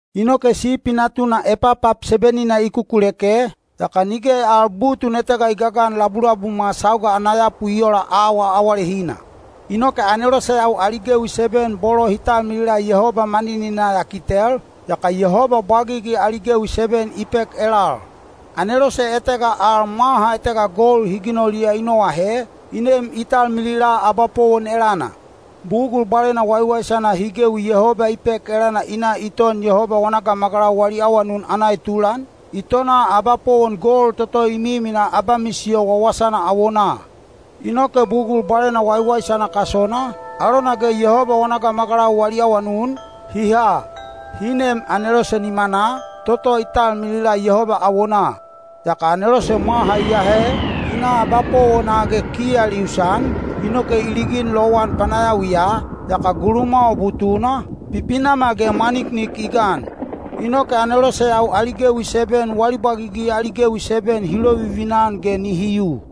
Inoke Sipi Natuna epapap seben-ina i kukuleke, yaka nige al butun etega i gagan labulabumwa sauga ana yapu i ola auwa awalehina. Inoke aneloseyau ali gewi seben bolo hi talmilila Yehoba manininaa ya kitel, yaka Yehoba bwagigi ali gewi seben i pek elal. Anelose etega al mwaha etega gold hi ginoliya i noahe, i nem i talmilila abapowon elana. Bugul bwalena waiwaisana hi gewi Yehoba i pek elana i na i ton Yehoba wana gamagalau wali awanun ana etulan, i tona abapowon gold toto i miminaa abamisiyo wawasana awonaa. Inoke bugul bwalena waiwaisana kasona, alona ge Yehoba wana gamagalau wali awanun, hi ha, hi neem anelose nimanaa, toto i talmilila Yehoba awonaa. Yaka anelose mwaha i ahe, i na abapowona ge kiyal i usan, inoke i ligin lowan panayawiya, yaka gulumwawa butuna, pipinamal ge mwaniknik i gan. Inoke aneloseyau ali gewi seben wali bwagigi ali gewi seben hi lovivina-an ge nihi yu.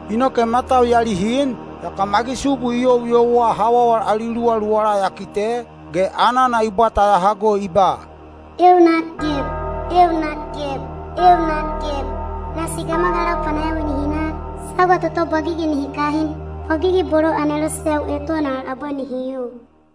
Inoke matau ya lihin, yaka magisubu i youyouwa hawawal ali luwaluwala ya kite, ge anana i bwata ya hago i ba, “Eeu nak geb! Eeu nak geb! Eeu nak geb! Nasi gamagalau panayawi nihi nak, sauga toto bwagigi nihi kahin, bwagigi bolo aneloseyau eton al abwe nihi yu.”